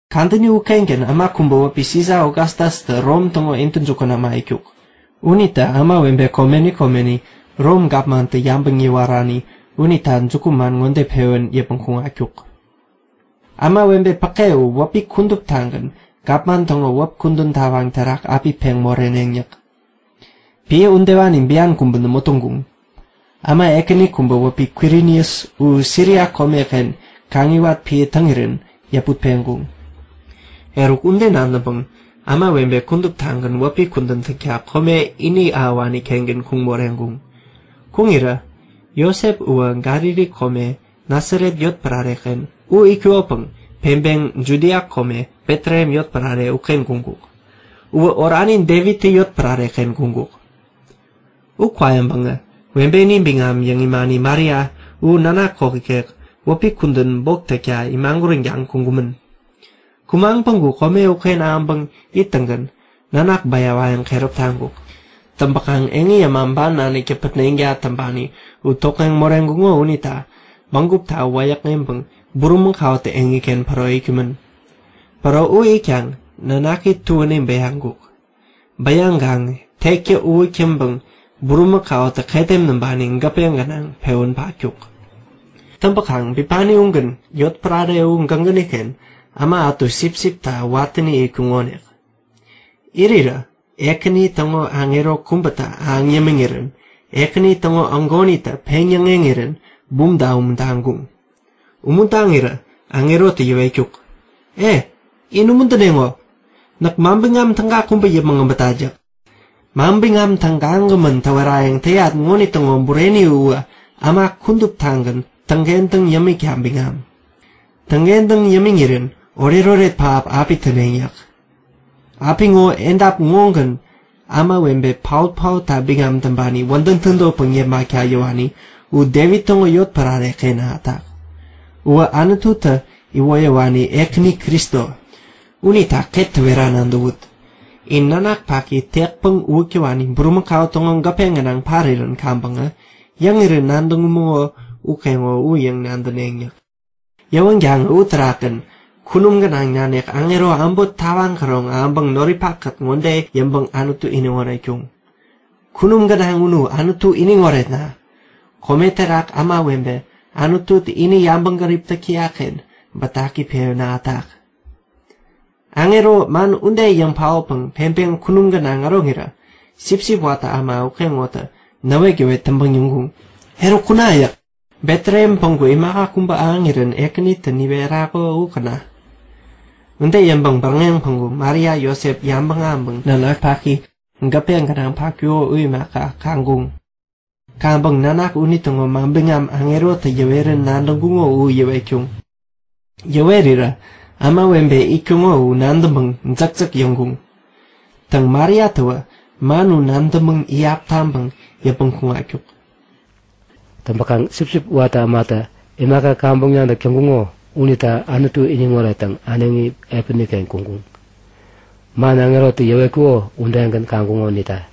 Kadäni ukengän äma kubä wäpi Sisa Ogastastä Rom täŋo intäjukun äma itkuk. Unitä ämawebe komeni komeni Rom gapmantä yabäŋ yäwarani unita jukuman ŋode pewän yäpmäŋ kuŋatkuk; Ämawebe päke u wäpi kuduptagän gapman täŋo wäp kudän tawaŋ terak api peŋ moreneŋ yäk. (Piä udewani bian kubä nämo täŋkuŋ. Äma ekäni kubä wäpi Kwirinus u Siria komeken kaŋiwat piä täŋirän yäput peŋkuŋ.) Eruk, ude nadäŋpäŋ ämawebe kuduptagän wäpi kudän täkta kome ini ahäwani-kengän kuŋ moreŋkuŋ. Kuŋirä Josep uwä Galili kome Nasaret yotpärare-ken u itkukopäŋ peŋpeŋ Judia kome Betlehem yotpärare uken kuŋkuk. Uwä orani Devittä yotpärare-ken kuŋkuk. U kwayäŋpäŋä webeni biŋam yäŋ imani Maria u nanak kok ikek wäpi kudän bok täkta imaguränkaŋ kuŋkumän. Kumaŋ päŋku kome uken ahäŋpäŋ ittäŋgän nanak bäyawayäŋ keräp taŋkuk. Täŋpäkaŋ eŋi äma ban naniktä pätneŋta täŋpani u tokŋeŋ moreŋkuŋo unita bägupta wäyäkŋeŋpäŋ bulimakautä eŋiken päro itkumän. Päro u itkaŋ nanaki tuäni bäyaŋkuk. Bäyaŋkaŋ tektä uwäk täŋpäŋ bulimakautä ketem näŋpani gäpe gänaŋ pewän patkuk. Täŋpäkaŋ bipani ugän yotpärare u gägäni-ken äma ätu sipsipta watäni itkuŋonik. Irirä Ekäni täŋo aŋero kubätä ahäŋ yämiŋkuk. Ahäŋ yämiŋirän Ekäni täŋo peŋyäŋek ägonitä peŋ-yäŋeŋirän bumta umuntaŋkuŋ. Umuntaŋirä aŋerotä yäwetkuk; E, in umuntäneŋo! Näk manbiŋam täga kubä yäpmäŋ abätat yäk. Manbiŋam tägagämän täwerayäŋ täyat ŋonitäŋo bureni uwä äma kuduptagän täŋkentäŋ yämikta biŋam! Täŋkentäŋ yämiŋirän oretoret pähap api täneŋ yäk. Apiŋo edap ŋogän ämawebe paot-paotta biŋam täŋpani wädäŋ tädotpäŋ yepmakta yäwani u Devit täŋo yotpärare-ken ahätak. Uwä Anututä iwoyäwani Ekäni Kristo! Unita ket täwera nadäwut; In nanak paki tekpäŋ uwäk täwani bulimakau täŋo gäpe gänaŋ parirän kaŋpäŋä yäŋirän nadäŋkumäŋo ukeŋo u yäŋ kaŋ nadäwut yäk. Yäwänkaŋä uterakgän kunum gänaŋ nanik aŋero äbot tawaŋ käroŋ ahäŋpäŋ noripak-kät ŋode yäŋpäŋ Anutu iniŋ oretkuŋ; Kunum gänaŋ unu Anutu iniŋ oretna! Kome terak ämawebe Anututä ini yabäŋgärip täk täyak-ken bätaki pewän ahätak. Aŋerotä man ude yäŋ paotpäŋ peŋpeŋ kunum gänaŋ äroŋirä sipsip watä äma ukeŋonitä näwetgäwet täŋpäŋ yäŋkuŋ; Eruk kuna! yäk. Betlehem päŋku imaka kubä ahäŋirän Ekänitä niwerako u käna! Ude yäŋpäŋ bäräŋeŋ päŋku Maria Josep yabäŋ ahäŋpäŋ nanak paki gäpe gänaŋ patkuko u imaka, kaŋkuŋ. Kaŋpäŋ nanak unitäŋo manbiŋam aŋerotä yäwerän nadäŋkuŋo u yäwetkuŋ. Yäwerirä ämawebe itkuŋo u nadäŋpäŋ jäkjäk yambuŋ. Täŋ, Mariatäwä man u nadäŋpäŋ iyap taŋpäŋ yäpmäŋ kuŋatkuk. Täŋpäkaŋ sipsip watä ämatä imaka kaŋpäŋ nadäk täŋkuŋo unita Anutu iniŋ orettäŋ äneŋi piäni-ken kuŋkuŋ. Man aŋerotä yäwetkuko udegän kaŋkuŋo unita.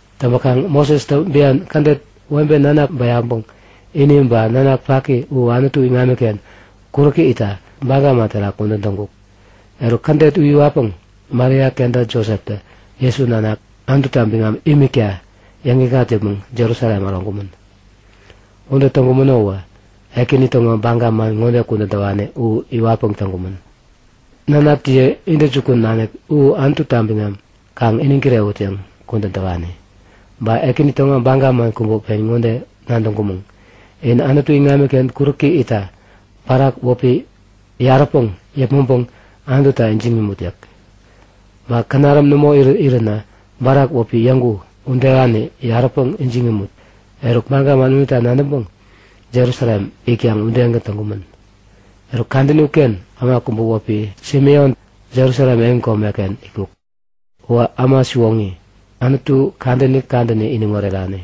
Täŋpäkaŋ Mosestä bian kädet webe nanak bäyaŋpäŋ ini ba nanak paki u Anutu iŋamiken kuräki itta baga man terak kudän täŋkuk. Eruk, kädet u iwatpäŋ Maria kenta Joseptä Jesu nanak Anututa biŋam imikta yäŋikŋat yäpmäŋ Jerusalem äroŋkumän. Ude täŋkumäno uwä Ekäni täŋo baga man ŋode kudän täwani u iwatpäŋ täŋkumän; Nanakjiye intäjukun nanik u Anututa biŋam kaŋ iniŋ kirewut yäŋ kudän täwani. Ba Ekäni täŋo baga man kubä pen ŋode nadäŋkumän; In Anutu iŋamiken kuräki itta barak wäpi känaräm yaräpäŋ yäpmäŋpäŋ Anututa ijiŋ imut yäk. Ba känaräm nämo iränä barak wäpi yägu udewani yaräpäŋ ijiŋ imut. Eruk, baga man unita nadäŋpäŋ Jerusalem itkaŋ udegän täŋkumän. Eruk kadäni uken äma kubä wäpi Simeon Jerusalem yotpärare-ken itkuk. Uwä äma siwoŋi, Anutu kadäni kadäni iniŋ orerani.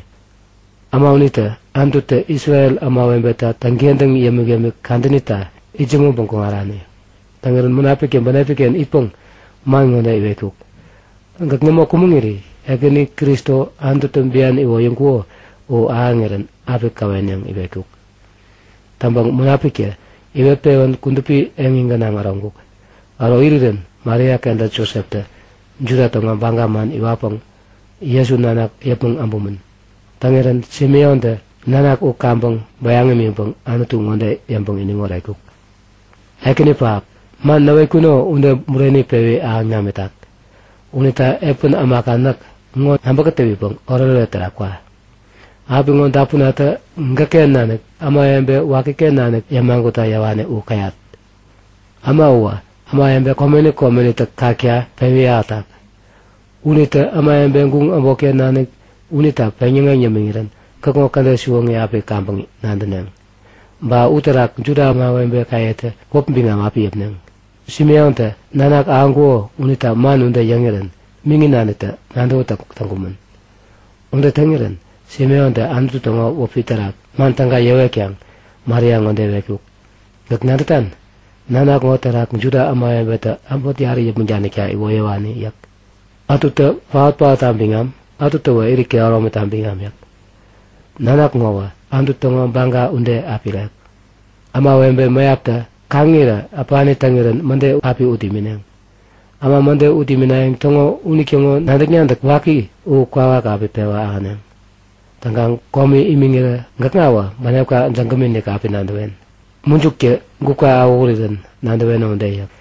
Äma unitä Anututä Isrel ämawebeta täŋkentäŋ yämik-yämik kadänita itsämäŋpäŋ kuŋarani. Täŋirän Munapiktä bänepi-ken itpäŋ man ŋode iwetkuk; Gäk nämo kumäŋiri Ekäni Kristo Anututä bian iwoyäŋkuko u ahäŋirän api käwen yäŋ iwetkuk. Täŋpäŋ Munapiktä iwet-pewän kudupi eŋi gänaŋ äroŋkuk. Äro irirän Maria kenta Joseptä Juda täŋo baga man iwatpäŋ Jesu nanak yäpmäŋ äbumän. Täŋirän Simeontä nanak u kaŋpäŋ bäyaŋ imiŋpäŋ Anutu ŋode yäŋpäŋ iniŋ oretkuk; Ekäni pähap! Man näwetkuno ude bureni pewi ahäŋ namitak unita piä ämaka näk ŋo nabä kätäwipäŋ oretoret terak kwa. Apiŋo dapunatä gäkken nanik ämawebe wakiken nanik yämagutta yäwani u käyat. Äma uwä ämawebe komeni komenitä kakta pewi ahätak. Unitä ämawebe guŋ äbotken nanik unita peŋyäŋeŋ yämiŋirän gäkŋo kädet siwoŋi api kaŋpäŋ nadäneŋ. Ba uterak Juda ämawebekayetä wäp biŋam api yäpneŋ. Simeontä nanak ahäŋkuko unita man ude yäŋirän miŋi nanitä nadäwätäk täŋkumän. Ude täŋirän Simeontä Anutu täŋo wäpi terak man täga yäwetkaŋ Maria ŋode iwetkuk; Gäk nadätan? Nanak ŋo terak Juda ämawebetä äbot yarä yäpmäŋ danikta iwoyäwani yäk. Ätutä paot-paotta biŋam, ätutäwä irit kehäromita biŋam yäk. Nanak ŋowä Anutu täŋo baga ude api irek. Ämawebe mäyaptä kaŋirä äpani täŋirän mäde api ut imineŋ. Äma mäde ut iminayäŋ täŋo unitäŋo nadäk-nadäk waki u kwawak api pewä ahäneŋ. Täŋkaŋ komi imiŋirä gäkŋawä bänepkatä jägämi-inik api nadäwen, mujuktä gupka awähurirän nadäweno ude yäk.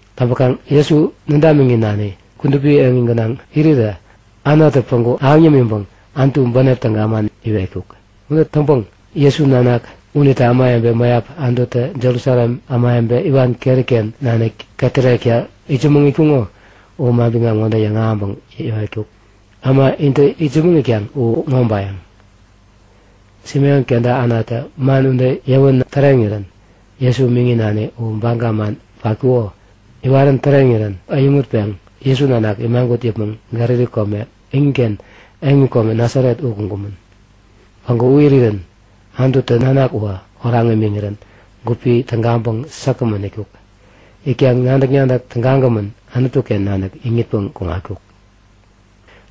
Täŋpäkaŋ Jesu nädamiŋi nani kudupi eŋi gänaŋ irirä Anatä päŋku ahäŋ yämiŋpäŋ Anutu bänep täga man iwetkuk. Ude täŋpäŋ Jesu nanak unita ämawebe mäyap Anututä Jerusalem ämawebe iwan keri-ken nanik ketärekta itsämäŋ itkuŋo u manbiŋam ŋode yäŋahäŋpäŋ yäwetkuk; Äma intä itsämäŋ itkaŋ u ŋobayäŋ! Simeon kenta Anatä man ude yäwän täreŋirän Jesu miŋi nani u baga man patkuko iwarän täreŋirän äyäŋutpeŋ Jesu nanak imagut yäpmäŋ Galili kome iniken yotpärare Nasaret u kuŋkumän. Päŋku u irirä Anututä nanak uwä oraŋ imiŋirän gupi tägaŋpäŋ säkgämän itkuk. Itkaŋ nadäk-nadäk tägagämän, Anutu-ken nanik iŋitpäŋ kuŋatkuk.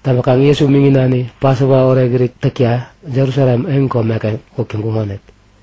Täŋpäkaŋ Jesu miŋi nani Pasova orekirit täkta Jerusalem yotpärare-ken kuk täŋkumänonik.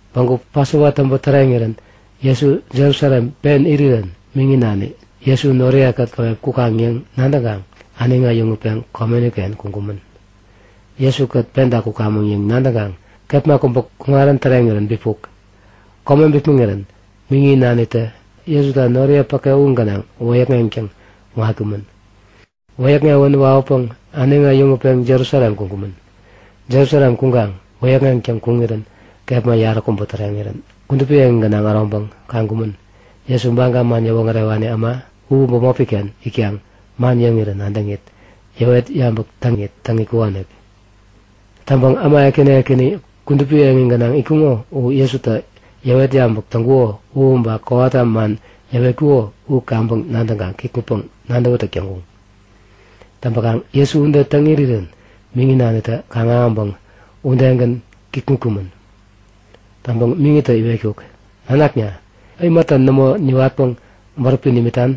Päŋku Pasova täŋpä täreŋirän Jesu Jerusalem pen irirän miŋi nani Jesu noriye-kät käwep kukaŋ yäŋ nadäŋkaŋ äneŋi äyäŋutpeŋ komeni-ken kuŋkumän. Jesu-kät penta kukamäŋ yäŋ nadäŋkaŋ kepma kubä kuŋarän bipuk. Kome bipmäŋirän miŋi nanitä Jesuta noriye päke u gänaŋ wäyäkŋeŋtäŋ kuŋatkumän. Wäyäkŋewän wawäpäŋ äneŋi äyäŋutpeŋ Jerusalem kuŋkumän. Jerusalem kuŋkaŋ wäyäkŋeŋtäŋ kuŋarirän kepma yaräkubä täreŋirän kudupi eŋi gänaŋ äroŋpäŋ kaŋkumän. Jesu Baga man yäwoŋärewani äma u bämopi-ken itkaŋ man yäŋirä nadäŋit, yäwet yabäk täŋit täŋ itkukonik. Täŋpäŋ äma ekäni ekäni kudupi eŋi gänaŋ itkuŋo u Jesutä yäwet yabäk täŋkuko u ba kowata man yäwetkuko u kaŋpäŋ nadäkaŋ kikŋutpäŋ nadäwätäk täŋkuŋ. Täŋpäkaŋ Jesu ude täŋ irirän miŋi nanitä kaŋ-ahäŋpäŋ udegän kikŋutkumän. Täŋpäŋ miŋitä iwetkuk; Nanakna, imata nämo niwatpäŋ bäräpi nimitan?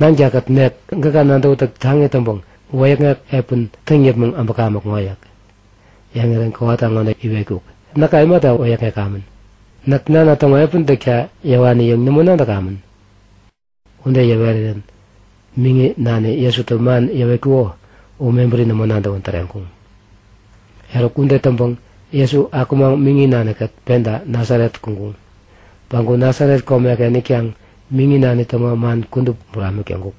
Nankakät nek gäka nadäwätäk taŋi täŋpäŋ wäyäkŋek piä täŋ yäpmäŋ äbäkamäk ŋo yäk. Yäŋirän kowata ŋode iwetkuk; Näka imata wäyäkŋekamän? Näk Nana täŋo piä täkta yäwani yäŋ nämo nadäkamän? Ude yäwerirän miŋi nani Jesutä man yäwetkuko u mebäri nämo nadäwän täreŋkuŋ. Eruk, ude täŋpäŋ Jesu akumaŋ miŋi nani-kät penta Nasaret kuŋkuŋ. Päŋku Nasaret komeken itkaŋ miŋi nani täŋo man kudup buramik täŋkuk.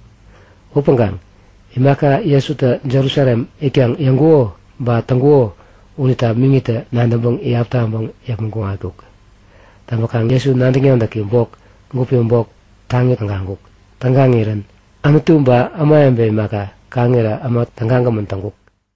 Upäŋkaŋ imaka Jesutä Jerusalem itkaŋ yäŋkuko ba täŋkuko unita miŋitä nadäŋpäŋ iyap taŋpäŋ yäpmäŋ kuŋatkuk. Täŋpäkaŋ Jesu nadäk-nadäki bok gupi bok taŋi tägaŋkuk. Tägaŋirän Anutu ba ämawebe imaka, kaŋirä äma tägagämän täŋkuk.